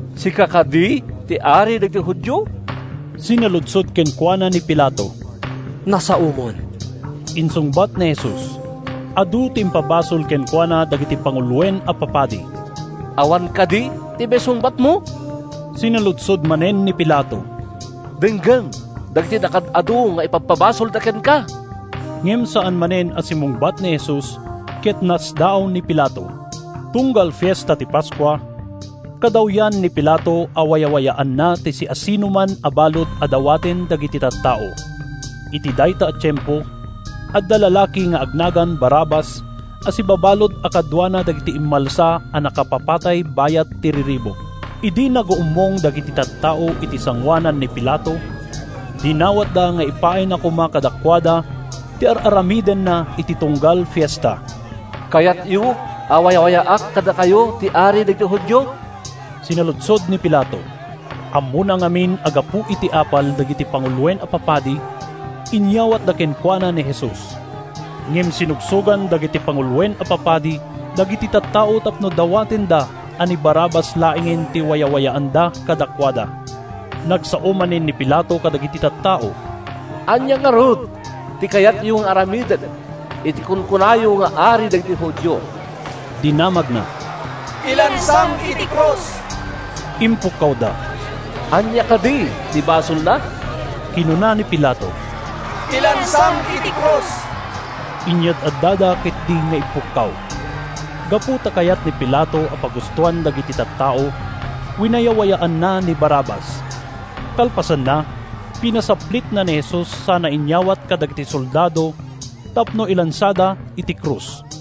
“Sika kadi ti Ari dagiti Judio?” sinaludsod kenkuana ni Pilato. “Nasaomon,” insungbat ni Jesus. Adu ti impabasol kenkuana dagiti panguloen a papadi. “Awan kadi ti maisungbatmo?” sinaludsod manen ni Pilato. “Denggem dagiti nakaad-adu nga ipabpabasolda kenka!” Ngem saan manen a simmungbat ni Jesus, ket nasdaaw ni Pilato. Tunggal Fiesta ti Paskua, kadawyan ni Pilato a wayawayaanna ti siasinoman a balud a dawaten dagiti tattao. Iti dayta a tiempo, adda lalaki nga agnagan Barrabas a sibabalud a kaduana dagiti immalsa a nakapapatay bayat ti riribuk. Idi naguummong dagiti tattao iti sangoanan ni Pilato, dinawatda nga ipaayna koma kadakuada ti ar-aramidenna iti tunggal fiesta. “Kayatyo a wayawayaak kadakayo ti Ari dagiti Judio?” sinaludsod ni Pilato. Ammona ngamin a gapu iti apal dagiti panguloen a papadi, inyawatda kenkuana ni Jesus. Ngem sinugsogan dagiti panguloen a papadi dagiti tattao tapno dawatenda a ni Barrabas laengen ti wayawayaanna kadakuada. Nagsao manen ni Pilato kadagiti tattao. “Ania ngarud ti kayatyo nga aramidek iti kunkunayo nga Ari dagiti Judio?” dinamagna. “Ilansam iti krus!” impukkawda. “Ania kadi ti basolna?” kinuna ni Pilato. “Ilansam iti krus!” inyad-addada ketdi nga impukkaw. Gapu ta kayat ni Pilato a pagustoan dagiti tattao, winayawayaanna ni Barrabas. Kalpasanna, pinasaplitna ni Jesus sana inyawat kadagiti soldado tapno ilansada iti krus.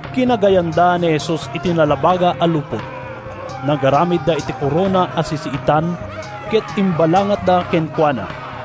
Kinagayanda ni Jesus iti nalabaga a lupot. Nagaramidda iti korona a sisiitan ket imbalangatda kenkuana.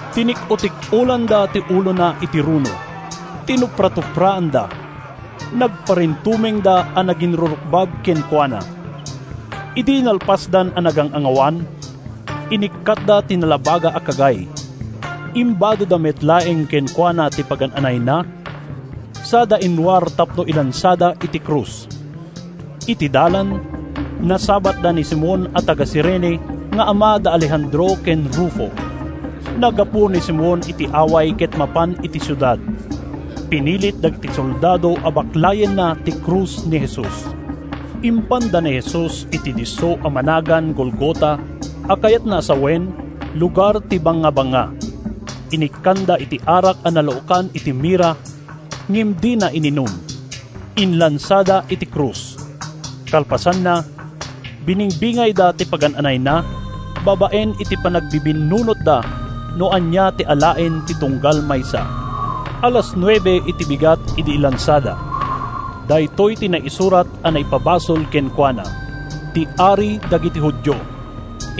Tinik-otik-olanda ti ulona iti runo. Tinupratupraanda. Nagparintumengda a naginrurukbab kenkuana. Idi nalpasdan a nagang-angawan, inikkatda ti nalabaga a kagay. Imbadoda met laeng kenkuana ti pagan-anayna sada inruar tapno ilansada iti krus. Iti dalan, nasabatda ni Simon a taga-Cirene nga ama da Alejandro ken Rufo. Naggapu ni Simon iti away ket mapan iti siudad. Pinilit dagiti soldado a baklayenna ti krus ni Jesus. Impanda ni Jesus iti disso a managan Golgota, a kayatna a sawen, “Lugar ti Bangabanga.” Inikkanda iti arak a nalaokan iti mirra, ngem dina ininum. Inlansada iti krus. Kalpasanna, biningbingayda ti pagan-anayna, babaen iti panagbibinnunotda no ania ti alaen ti tunggal maysa. Alas nuebe iti bigat idi ilansada. Daytoy ti naisurat a naipabasol kenkuana: “Ti Ari dagiti Judio.”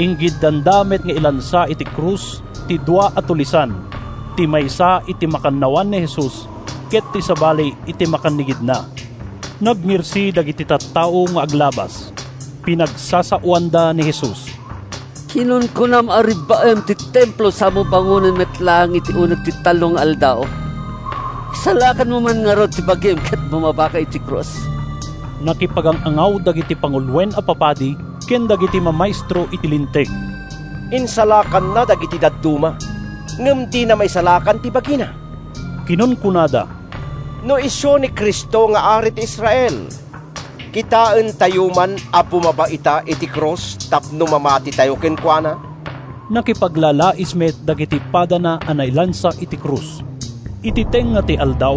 Inggiddanda met nga inlansa iti krus ti dua a tulisan: ti maysa iti makannawan ni Jesus, ket ti sabali iti makannigidna. Nagngirsi dagiti tattao nga aglabas. Pinagsasaoanda ni Jesus: “Kinunkunam a rebbaem ti Templo samo bangonen met laeng iti uneg ti tallo nga aldaw. Isalakanmo man ngarud ta bagim ket bumabaka iti krus.” Nakipagang-angaw dagiti panguloen a papadi, ken dagiti mamaestro iti Linteg. “Insalakanna dagiti dadduma ngem dina maisalakan ti bagina,” kinunkunada. “No isu ti Cristo nga Ari ti Israel, kitaentayo man a bumaba ita iti krus tapno mamatitayo kenkuana.” Nakipaglalais met dagiti padana a nailansa iti krus. Iti tengnga ti aldaw,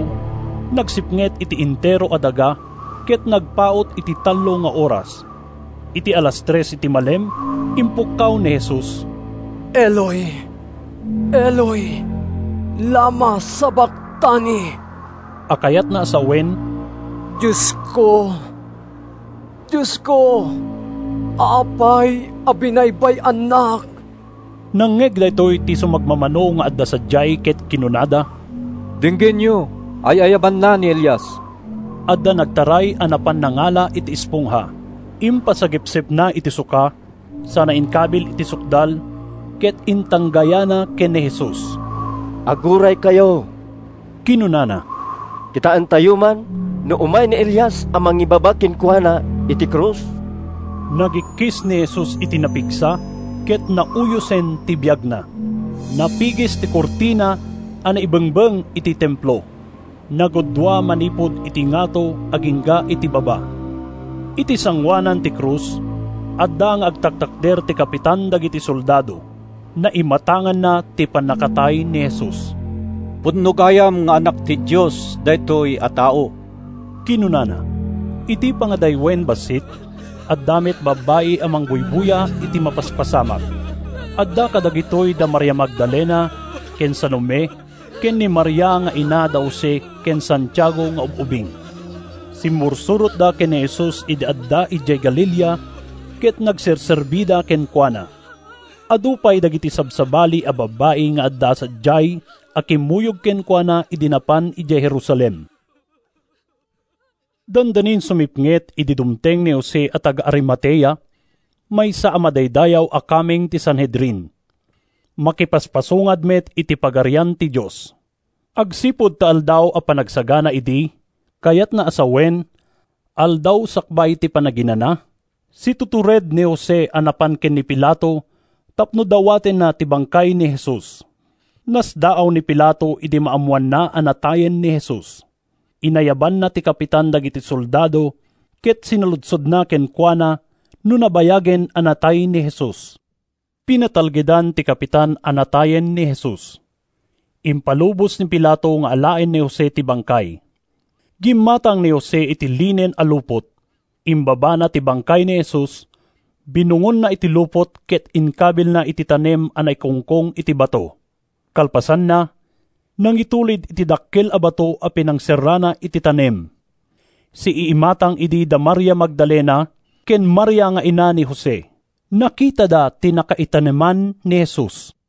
nagsipnget iti entero a daga ket nagpaut iti tallo nga oras. Iti alas tres iti malem, impukkaw ni Jesus, “Eloi, Eloi, lama sabaktani?” a kayatna a sawen, “Diosko, Diosko, apay a binaybay-annak?” Nangngeg daytoy ti sumagmamano nga adda sadiay ket kinunada, “Denggenyo, ay-ayabanna ni Elias!” Adda nagtaray a napan nangala iti espongha. Impasagepsepna iti suka sana inkabil iti sukdal ket intanggayana ken ni Jesus. “Aguraykayo!” kinunana. “Kitaentayo man no umay ni Elias a mangibaba kenkuana iti krus!” Nagikkis ni Jesus iti napigsa ket nauyosen ti biagna. Napigis ti kurtina a naibengbeng iti Templo: naggudua manipud iti ngato agingga iti baba. Iti sangoanan ti krus, adda nga agtaktakder ti kapitan dagiti soldado. Naimatanganna ti pannakatay ni Jesus. “Pudno gayam nga anak ti Dios daytoy a tao,” kinunana. Iti pangadaywen bassit, adda met babbai a mangbuybuya iti mapaspasamak. Adda kadagitoy da Maria Magdalena ken Salome ken ni Maria nga ina da Jose ken Santiago nga ub-ubing. Simmursurotda ken ni Jesus idi adda idiay Galilea, ket nagserserbida kenkuana. Adu pay dagiti sabsabali a babbai nga adda sadiay a kimmuyog kenkuana idi napan idiay Jerusalem. Dandanin sumipnget idi dumteng ni Jose a taga-Arimatea, maysa a madaydayaw a kameng ti Sanhedrin. Makipagpaspasungad met iti Pagarian ti Dios. Agsipud ta Aldaw a Panagsagana idi, kayatna a sawen, aldaw sakbay ti Panaginana, situtured ni Jose a napan ken ni Pilato tapno dawatenna ti bangkay ni Jesus. Nasdaaw ni Pilato idi maammoanna a natayen ni Jesus. Inayabanna ti kapitan dagiti soldado ket sinaludsodna kenkuana no nabayagen a natay ni Jesus. Pinatalgedan ti kapitan a natayen ni Jesus. Impalubos ni Pilato nga alaen ni Jose ti bangkay. Gimmatang ni Jose iti linen a lupot. Imbabana ti bangkay ni Jesus, binungonna iti lupot ket inkabilna iti tanem a naikungkong iti bato. Kalpasanna, nangitulid iti dakkel a bato a pinangserrana iti tanem. Siiimatang idi da Maria Magdalena ken Maria nga ina ni Jose. Nakitada ti nakaitaneman ni Jesus.